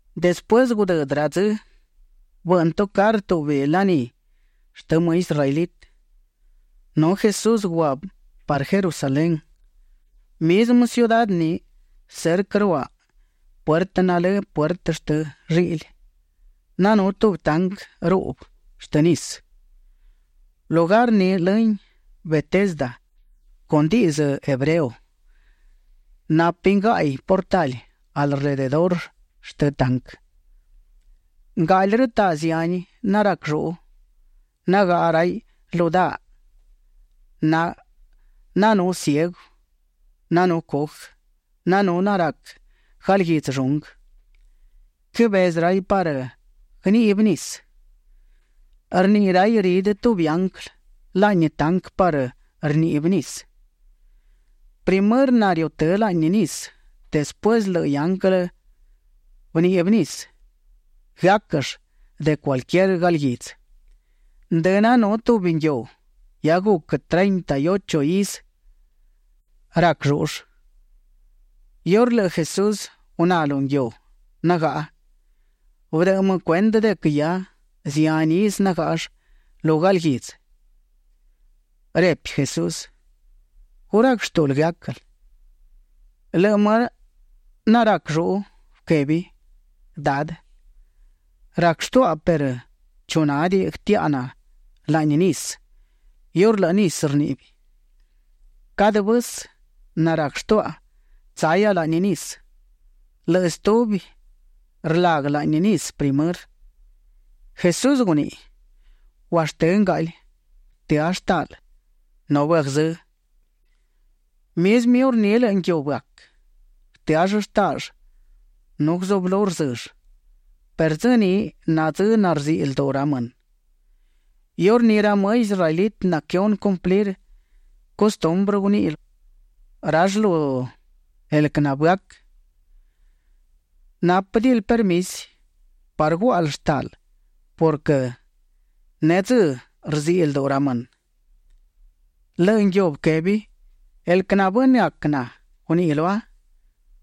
Despuësë gudëdë ra dzë, bëꞌnë tucarë tubi laní shtë më israelitë, nu Jesús gua parë Jerusalén. Mizmë ciudá ni cerquë ruaꞌ puertë nalë Puertë shtë Lliꞌli, nanú tubi tanquë ruꞌbë shtë nisë. Lugar ni lëhin Betesda con dizë́ hebreo. Napin gaꞌi portali alrededurë shtë tanquë. Ngaꞌli rëtaꞌ zihani narac lluꞌu; nagaꞌa raiꞌ lu daaꞌ. Nanú ciegu; nanú cujë; nanú narac galguidzë llunguë. Quëbezë raiꞌ parë guëniꞌbi nisë. Rniꞌi raiꞌ ridë tubi ianglë laꞌni tanquë parë rníꞌbiꞌ nisë. Primërë nariutë́ laꞌni nisë despuësë lëꞌë ianglë bëniꞌbi nisë, guëáquëll de cualquier galguidzë. Ndë nanú tubi nguiu; hia guc treinta y ocho izë rac llúꞌull. Iurë lëꞌë Jesús guná lu nguiu nagaꞌa, bëdëꞌë më cuendë de quë hia zihani izë nagáꞌall lu galguidzë. Repi Jesús: ―¿Gu rac shtúꞌul guëáquël? Lëꞌë më narac lluꞌu bëquebi: ―Dadë, rac shtuaꞌa perë chu nádiꞌi guëtiaꞌa na laꞌni nisë iurë lëꞌë nisë rniꞌbi. Cadë vësë narac shtuaꞌa tsahia laꞌni nisë, lëꞌë stubi rlaguë laꞌni nisë primërë. Jesús guniꞌi: ―Guashtë́ ngaꞌli. Bëtëá shtaaꞌl nu bëagzë́. Mizmë iurní lëꞌë nguiu bëac. Bëtëall shtaaꞌll nu guzublú rzëll. Perë dzë ni na dzë narziꞌi lduꞌu ra mënë. Iurní ra më israelitë naquëhunë cumplir custumbrë, guniꞌi rall lu el quë nabëac: ―Nápëdiꞌil permisi parë guáꞌal shtaaꞌl purquë nedzë́ rziꞌi lduꞌu ra mënë. Lëꞌë nguiu bëquebi: ―El quë nabënëac na guniꞌi lua: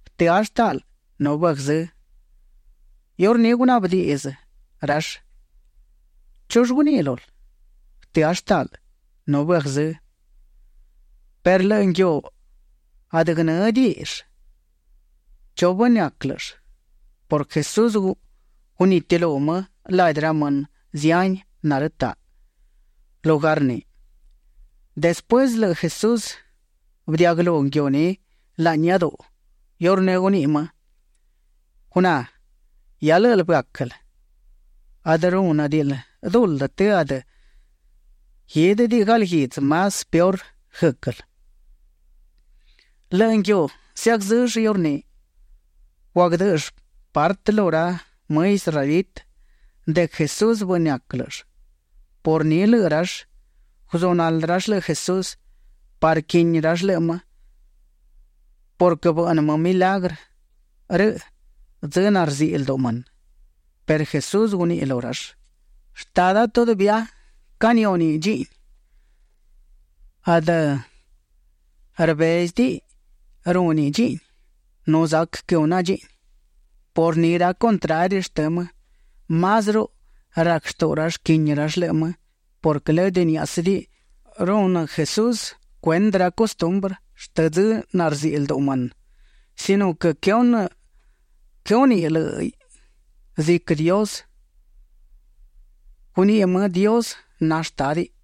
“Bëtëá shtaaꞌl nu bëagzë́”. Iurní gunaꞌbë diꞌdzë rall: ―¿Chull guniꞌi lul? “Bëtëá shtaaꞌl nu bëagzë́”. Perë lëꞌë nguiu adë guënë́diꞌill chu bënëac lë́ꞌëll purquë Jesús gunitilú më ladi ra mënë zihani narëtaꞌ lugar ni. Despuësë lëꞌë Jesús bëdiaꞌguëlú nguiu ni laꞌni iáduꞌu; iurní guniꞌi më: ―Guná, hia lë́ꞌël bëáquël; adë rúnëdiꞌil duldë të adë guídëdiꞌi galguidzë más peor guë́quël. Lëꞌë nguiu zëagzëll iurní. Guagdë́ꞌëll partë lu ra më israelitë de quë Jesús bënëac lë́ꞌëll. Por ni lëꞌë rall guzunaldë rall lëꞌë Jesús parë quini rall lëꞌë më purquë bëꞌnë më milagrë rëꞌ dzë narziꞌi lduꞌu mënë. Perë Jesús guniꞌi lu rall: ―Shtada todavía canihúniꞌ dchiꞌni; adë rbézëdiꞌi rúniꞌ dchiꞌni; nu zac quëhuna dchiꞌni. Por ni ra contrari shtë më, másruꞌu rac shtuꞌu rall quini rall lëꞌë më purquë lëdë niáꞌasëdiꞌi rúnëdiꞌi Jesús cuendë ra custumbrë shtë dzë narziꞌi lduꞌu mënë, sino quë quëhúniꞌ lë́ꞌiꞌ ziquë Dios; guniꞌi më Dios na Shtádiꞌ.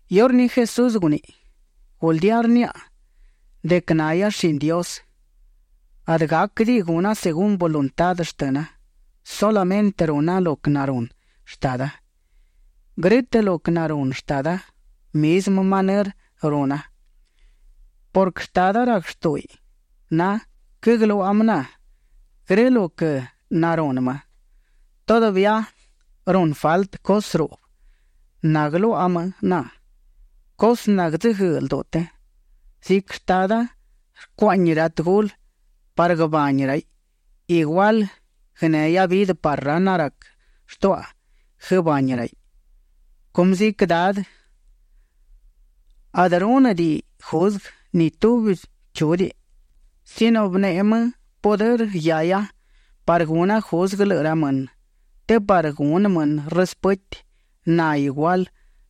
Iurní Jesús guniꞌi: ―Guldía rniaꞌa de quë nahia shini Dios; adë gáquëdiꞌi guna según voluntá shtëna; sulamëntë runa lo quë narunë Shtada. Grë́tëꞌ lo quë narunë Shtada, mizmë manërë runa purquë Shtada rac shtúꞌuiꞌ na. Quëgluaꞌa më na grë lo quë narunë më. Todavía runë faltë cusë ruꞌbë naguëluaꞌa më na, cusë nartsëguëëꞌ lduꞌu të. Ziquë Shtada rcuaꞌñi ra tëgulë parë guëbani raiꞌ, igual guënehia vidë parë ra narac shtuaꞌa guëbani raiꞌ. Cumë ziquë Dadë adë rúnëdiꞌiꞌ juzguë ni tubi chúdiꞌi, sino bëneꞌe më pudërë guiahia parë guna juzguë lëꞌë ra mënë të parë gunë mënë rëspëti na igual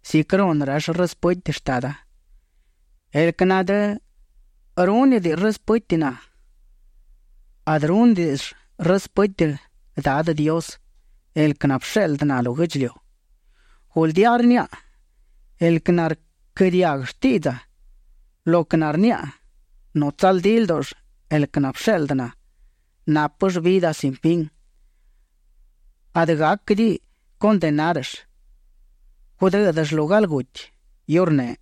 ziquë runë rall rëspëti Shtada. El quë nadë rúnëdiꞌi rëspëti na, adë rúnëdiꞌill rëspëti Dadë Dios, el quë nabësheꞌldë na lu guë́ꞌdchiliu. ’Guldía rniaꞌa, el quë narquë́ diaguë shtiꞌdza lo quë narniaꞌa nu tsaldí ldúꞌull el quë nabësheꞌldë na, nápëll vidë sin fin. Adë gáquëdiꞌi condenárëll; gudë́dëll lu galguti. Iurneꞌ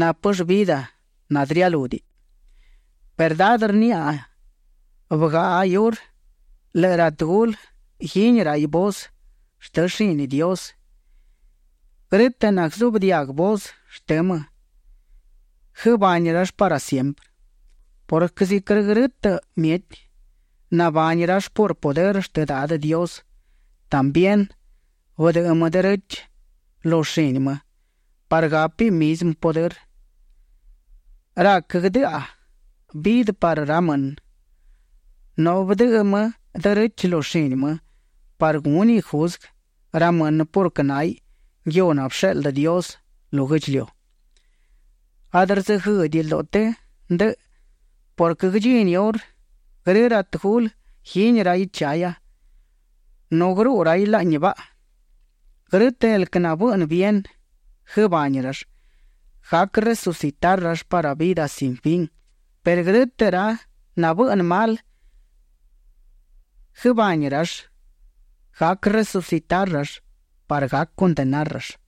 nápëll vidë nanadë rialúdiꞌi. Verdá rniaꞌa, hia bëgaꞌa iurë lëꞌë ra tëgulë guini raiꞌ voz shtë shini Dios. Grë́tëꞌ naguëzuꞌbë diaguë voz shtë më, guëbani rall parë siemprë purquë ziquë grë mieti nabani rall por pudërë shtë Dadë Dios, también bëdëꞌë më derechë lu shini më parë gápiꞌ mizmë pudërë. Rac guëdëꞌa vidë parë ra mënë. Nu bëdëꞌë më derechë lu shini më parë gúniꞌ juzguë ra mënë purquë náhiꞌ nguiu nabësheꞌldë Dios lu guë́ꞌdchiliu. Adë rdzëguëëꞌdiꞌi lduꞌu të ndëꞌë purquë guëdchini iurë grë ra tëgulë guini raiꞌ chahia, nu guëruꞌu raiꞌ laꞌni baꞌa. Grë́tëꞌ el quë nabëꞌnë bien, guëbani rall; gac resucitar rall parë vidë sin fin perë grë́tëꞌ ra nabëꞌnë mal, guëbani rall; gac resucitar rall parë gac condenar rall.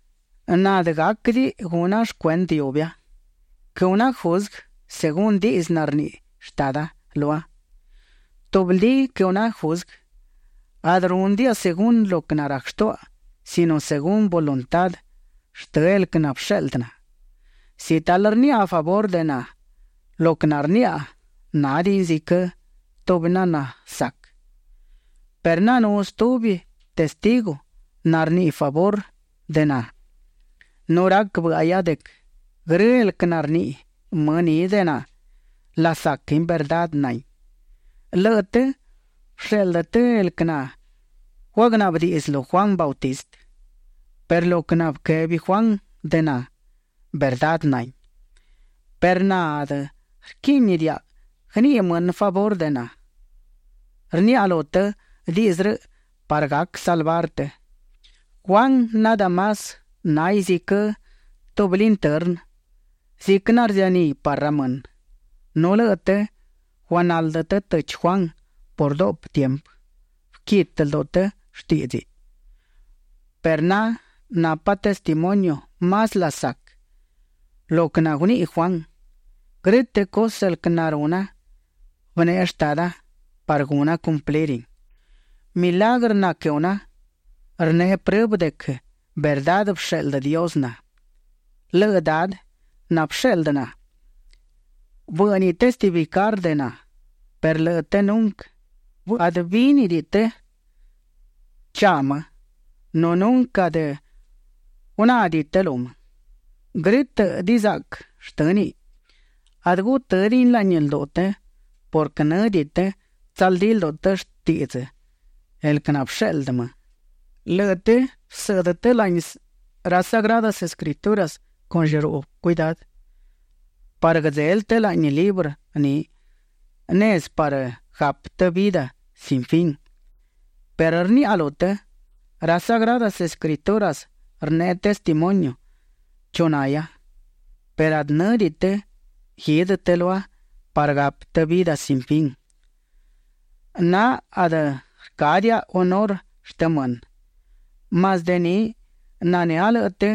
’Na adë gáquëdiꞌi guna shcuendë iubia; quëhuna juzguë según diꞌdzë narniꞌi Shtada lua. Tubldí quëhuna juzguë; adë rúnëdiaꞌa según lo quë narac shtuaꞌa sino según voluntá shtë el quë nabësheꞌldë na. Si talë rniaꞌa favurë de na, lo quë narniaꞌa nádiꞌin ziquë tubi nanasac perë nanú stubi testigu narniꞌi favurë de na. Nu rac bë́ꞌahia de quë grë el quë narniꞌi më ni de na, lasaquin; verdá nahin. Lëꞌë të bësheꞌldë të el quë naguagnaꞌbë diꞌdzë lu Juan Bautista, perë lo quë nabëquebi Juan de na, verdá nahin. Perë na adë rquíꞌnidiaꞌa guëniꞌi mënë favurë de na. Rniaꞌa lu të diꞌdzë rëꞌ parë gac salvar të. Juan nadë más náhiꞌ ziquë tubi lintërnë, ziquë narzianí parë ra mënë, nu lëꞌë të guagnaldë të tëchi Juan por duꞌpë tiempë. Bëquitë lduꞌu të shtíꞌdziꞌ. Perë na napa testimonio más lasac lo quë naguniꞌi Juan. Grë́tëꞌ cusë el quë naruna, bëneꞌe Shtada parë guna cumplirin. Milagrë naquëhuna, rneꞌe prëbë de quë verdá bësheꞌldë Dios na. Lëꞌë Dadë nabësheꞌldë na, bë́ꞌniꞌ testificar de na, perë lëꞌë të nunquë adë bínidiꞌi të chaꞌ më, nu nunquë adë gunádiꞌi të lu më. Grë́tëꞌ dizaꞌquë shtë́niꞌ, adë gutë́diꞌin laꞌni lduꞌu të purquë në́diꞌi të tsaldí lduꞌu të shtiꞌdzë el quë nabësheꞌldë më. Lëꞌë të bësëꞌdë të laꞌni ra Sagradas Escrituras con llëruꞌbë cuidá parë guëdzelë të laꞌni librë ni nezë parë gapë të vidë sin fin, perë rniaꞌa lu të, ra Sagradas Escrituras rneꞌe testimonio chu nahia perë adë në́diꞌi të guidë të lua parë gapë të vidë sin fin. ’Na adë rcádiaꞌa hunurë shtë mënë. Más de ni nanë́a lëꞌë të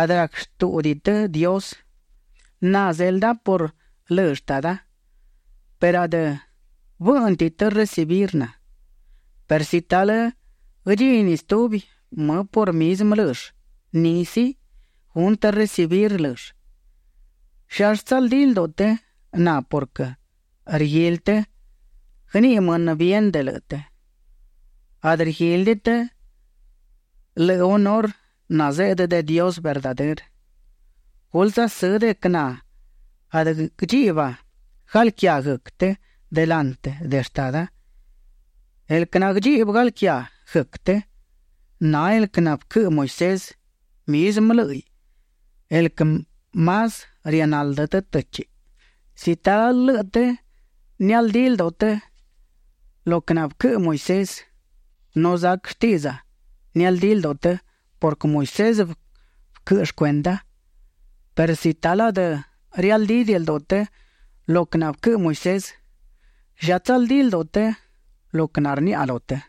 adë rac shtúꞌudiꞌi të Dios. Na zelda por lë Shtada, perë adë bë́ꞌnëdiꞌi të recibir na. Perë si talë guëdchini stubi më por mizmë lëll, ni sí, gunë të recibir lë́ꞌëll. ¿Llallë tsaldí lduꞌu të na purquë rguili të guëniꞌi mënë bien de lëꞌë të? Adë rguílidiꞌi të lëꞌë hunurë nazeꞌdë de Dios verdadërë. Gulë tsasë́ de quë na adë guëdchiꞌba galquiá guëc të delantë de Shtada. El quë naguëdchiꞌbë galquiá guëc të, na el quë nabëquëꞌë Moisés, mizmë lë́ꞌiꞌ el quë más rianaldë të të́chiꞌ. Si talë lëꞌë të nialdí lduꞌu të lo quë nabëquëꞌë Moisés, nu zac shtiꞌdza nialdí lduꞌu të purquë Moisés bëquëꞌë shcuenda. Perë si talë adë rialdídiꞌi lduꞌu të lo quë nabëquëꞌë Moisés ¿lla tsaldí lduꞌu të lo quë narniaꞌa lu të?